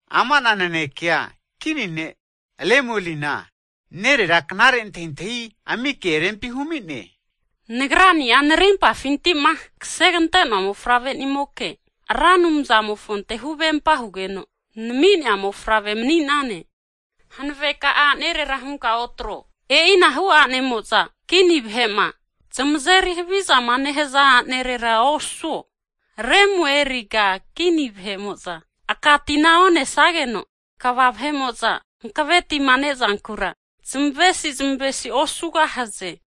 Ama'na nanekea, kini ne' Lemuelina nerera knare antahintahi ami ke rempi humi'ne. Nagrani'a narimpafinti'ma kasegante'noa mofavre'nimoke, Ra Anumzamofonte huvempa hugeno nami'nea mofavre mani'nane. Hanave ka'a a'nerera hunka otro. E'inahu a'nemo'za kini vahe'ma zamazeri havizama nehaza a'nerera osuo. Lemueliga kini vahe'mo'za aka tina onesageno, kva vahe'mo'za hanave tima nezankura zamavesi zamavesi osugahaze.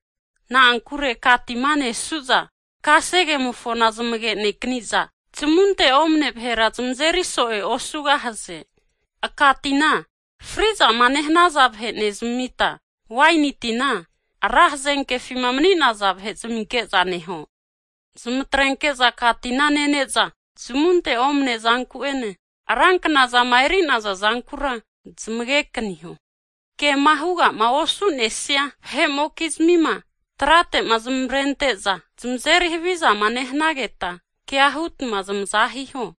Na'ankure aka tima nesuza kasegemofona zamage'nekaniza zamunte omane vahera zamazeri so'e osugahaze. Aka tina fri'zama nehanaza vahe nezamita, waini tina ra hazenkefima mani'naza vahe zaminke'za neho. Zmatrenke'za aka tina nene'za, zamunte omnea zanku'ene, ra knazama eri'naza zankura zmagekaniho. Kema hugama osu'nesia vahe'mokizmima, trate'ma zamavrente'za zmazeri havizama nehanageta, kea hutma zamaza hiho.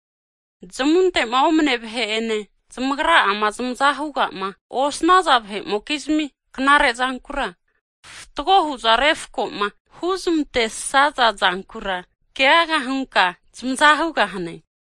Zamunte'ma omane vahe'ene, zamagra'ama zamaza hugama osanaza vahe'mokizmi knarezankura, fatgo huza refkoma huzmantesaza zankura keaga hunka zamaza hugahane.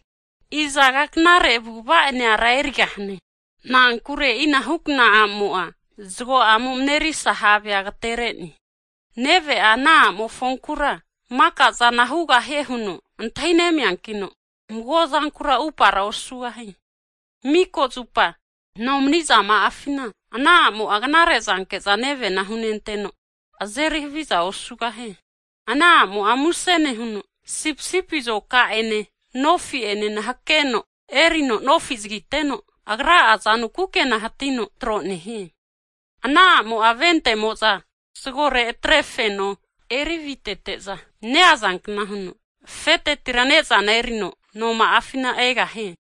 Izaga knare avu'ava ene ara erigahane? Na'ankure e'inahukna a'mo'a, zago'amo marerisa havea agaterene. Neve'a ana a'mofonkura makazana hugahie huno antahinemiankino, mago zankura upara osugahie. Mika zupa nomni'zama'afina, ana a'mo'a, knare zanke'za nevena hunenteno, azeri havizana osugahie. Ana a'mo'a muse nehuno sipisipi azoka ene nofi'ene hakeno erino nofi zagiteno, agra'a azanu kukena hatino tro nehie. Ana a'mo'a ventemo'za zagore atre feno eri avitete'za neazankna huno, afetetira nezana erino noma'afina egahie.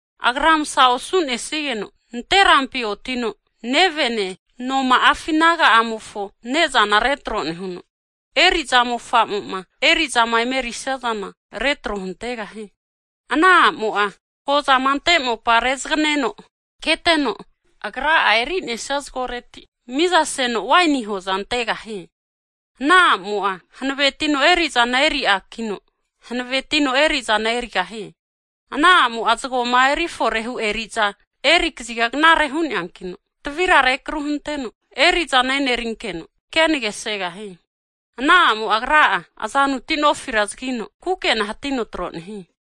Agra masa osu'nesigeno nanterampi otino nevene, noma'afi naga'amofo nezana retro nehuno, eri'za mofamo'ma erizama emerisia zana retro huntegahie. Ana a'mo'a hozama ante mopa rezagneno keteno, agra'a eri'nesia zagoreti mizaseno waini hoza antegahie. Ana a'mo'a hanavetino eri'zana eri a'kino, hanavetino erizana erigahie. Ana a'mo'a zgoma erifore'ma hu eri'za eri kaziga knare hu'neanakino, tavira rekru hunteno erizana e'nerinkeno kenage segahie. Ana a'mo'a agra'a, azanuti nofira zagino kukena hatino tro nehie.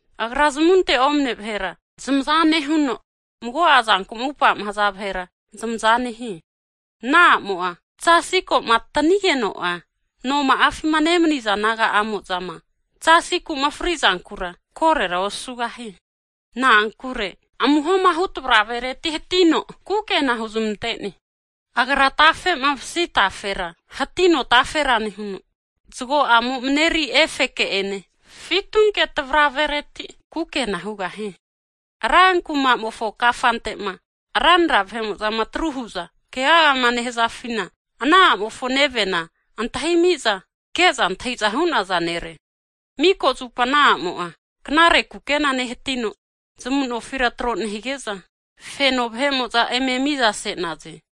Agra zamunte omane vahera zamaza nehuno, mago'a zanku'ma upama haza vahera zamaza nehie. Ana a'mo'a zasi koma atanigeno'a, noma'afima nemaniza naga'amo'zama zasiku'ma fri'zankura, korora osugahie. Na'ankure amuhoma hu tavravereti hatino kukena huzamantene. Agra tafe'ma masi tafera hatino tafera nehuno, zgo'amo mareri efeke ene fitunke tavravereti kukena hugahie. Rankumamofo kafantema ranra vahe'mo'zama atru huza kegagama nehazafina, ana a'mofo nevena antahimiza ke'za antahiza hu'naza nere. Mika zupa ana a'mo'a knare kukena nehatino, zamu'nofira tro nehige'za feno vahe'mo'za eme mizase'naze.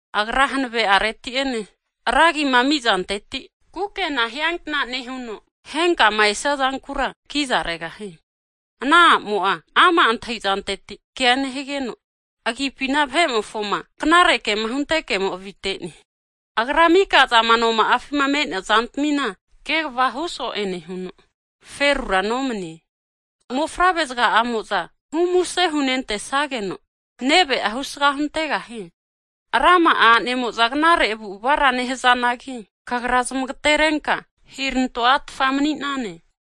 Agra hanave'areti'ene ra agima amizanteti kukena hiankna nehuno, henkama esia zankura kiza regahie. Ana a'mo'a ama' antahizanteti kea nehigeno, agipina vahe'mofoma knare kema hunte kemo avite'ne. Arga mika'zama noma'afima me'nea zantamina kegva hu so'e nehuno, ferura nomanie. Mofavre zga'amo'za hu muse hunentesageno, neve'a husga huntegahie. Rama'a a'nemo'za knare avu'avara nehazanagi, kagra zmagaterenka hiranto a'tfa mani'nane.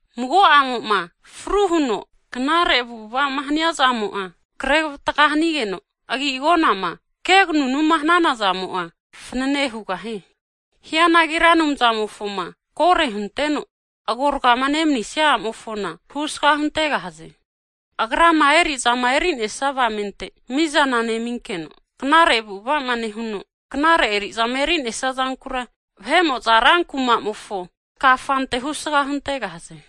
Mago a'mo'ma fru huno knare avu'avama haniazamo'a krevatga hanigeno, agi agonama keganunuma hananazamo'a, fanane hugahie. Hianagi Ra Anumzamofoma koro hunteno agorgama nemanisia a'mofona, husga huntegahaze. Agrama eri'zama eri'nesia avamente mizana neminkeno, knare avu'avama nehuno, knare eri'zama eri'nesia zankura, vahe'mo'za ra kumamofo kafante husga huntegahaze.